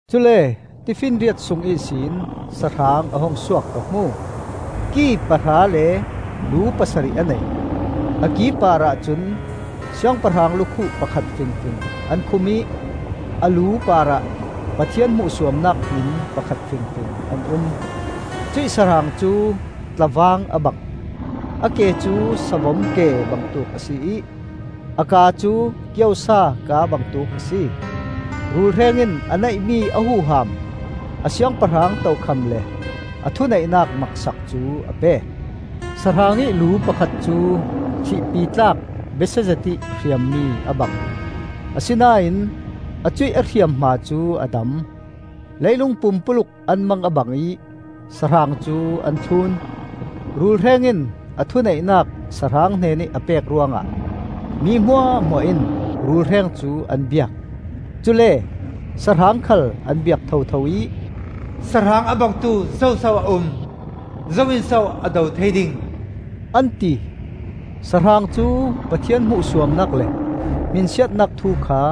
Cule tifinriat sung ihsin sahrang a hung suak ka hmu. Ki pahra le lu pasarih a nei; a ki parah cun siangpahrang lukhuh pakhat fingfing an khum ih a lu parah Pathian hmuhsuamnak hmin pakhat fingfing an um. Cuih sahrang cu tlavang a bang; a ke cu savom ke bangtuk a si ih a kaa cu kiosa kaa bangtuk a si. Rulhreng in a neihmi a huham, a siangpahrang tokham le a thuneihnak maksak cu a pek. Sahrang ih lu pakhat cu thihpi tlak besia zetih hriammi a bang, asinain a cuih a hriamhma cu a dam. Leilung pumpuluk an mang a bang ih sahrang cu an thlun. Rulhreng in a thuneihnak sahrang hnenih a pek ruangah mi hmuahhmuah in rulhreng cu an biak. Cule sahrang khal an biak thotho ih, “Sahrang a bangtu zoso a um? Zo in so a do thei ding?” an ti. Sahrang cu Pathian hmuhsuamnak le hminsiatnak thu kha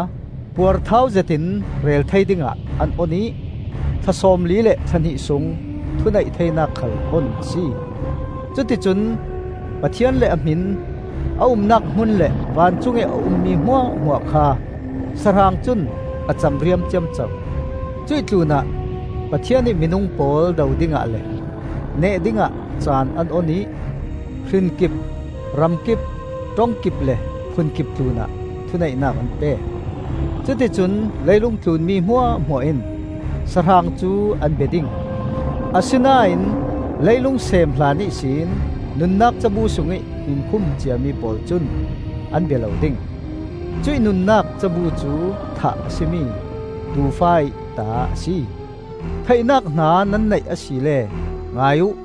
puarthau zetin rel thei dingah an on ih thla sawmli le thla hnih sung thuneih theinak khal on a si. Cuticun Pathian le a hmin, a umnak hmun le vancungih a ummi hmuahhmuah kha sahrang cun a camriam ciamco. Cuih tlunah Pathian ih minung pawl do dingah le neh dingah caan an on ih hrin kip, ram kip, ṭong kip, le phun kip tlunah thuneihnak an pek. Cuticun leilungtlun mi hmuahhmuah in sahrang cu an bia ding; asinain leilung seem hlan ihsin nunnak cabu sungih hmin khum ciami pawl cun an bia lo ding; cuih nunnak cabu cu thah a si mi Tuufa-ih ta a si. “Theihnak hna nan neih asile ngai uh!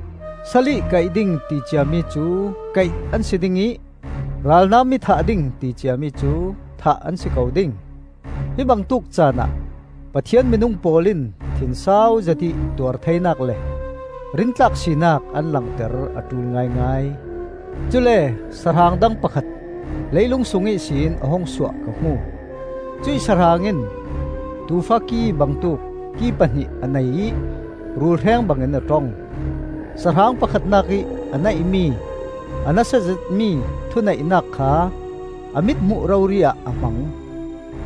Sal ih kaih ding ti ciami cu kaih an si ding ih ralnam ih thah ding ti ciami cu thah an si ko ding. Hi bangtuk caanah Pathian minung pawl in thinsau zetih tuar theinak le rintlak sinak an langter a ṭul ngaingai. Cule sahrang dang pakhat leilung sung ihsin a hung suah ka hmu. Cuih sahrang in tuufa ki bangtuk ki pahnih a nei ih rulhreng bangin a ṭong. Sahrang pakhatnak ih a neihmi a nasa zetmi thuneihnak kha a mithmuh rori-ah a hmang.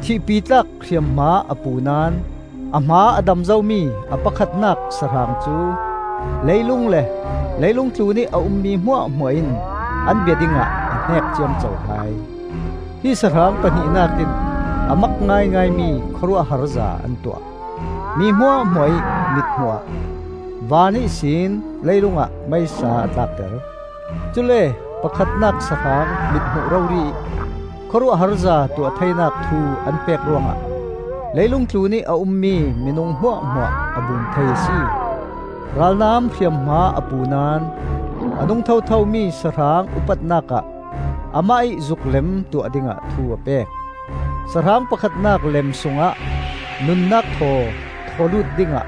Thihpi tlak hriamhma a pu naón a hma a dam zomi a pakhatnak sahrang cu leilung le leilung tlunih a ummi hmuahhmuah in an bia dingah a hneek ciamco hai. Hi sahrang pahnihnak in a mak ngaingaimi khawruahharza an tuah. Mi hmuahhmuah ih mithmuh ah van ihsin leilungah meisa a tlakter. Cule pakhatnak sahrang mithmuh rori ih khawruahharza tuah theinak thu an pek ruangah leilung tlunih a ummi minung hmuahhmuah a bum thei a si. Ralnam hriamhma a pu naón a nung thothomi sahrang upatnak ah amah ih zuklem tuah dingah thu a pek. Sahrang pakhatnak lem sungah nunnak thaw thawlut dingah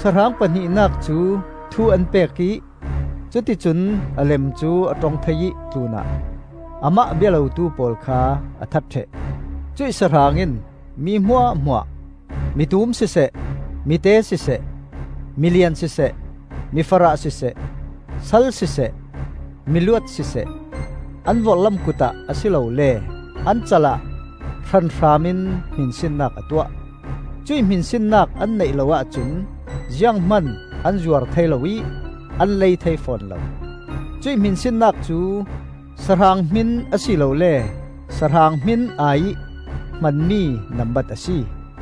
sahrang pahnihnak cu thu an pek ih cuticun a lem cu a ṭong thei ih tlunah amah a bia lotu pawl kha a that ṭheh. Cuih sahrang in mi hmuahhmuah, mitum siseh mite siseh, milian siseh mifarah siseh, sal siseh, miluat siseh, an vorhlam kutah a si lole an cal ah hranhram in hminsinnak a tuah. Cuih hminsinnak an neih lo ahcun zianghman an zuar thei lo ih an lei thei fawn lo; cuih hminsinnak cu sahrang hmin a si lole sahrang hmin ai-ih hmanmi nambat a si.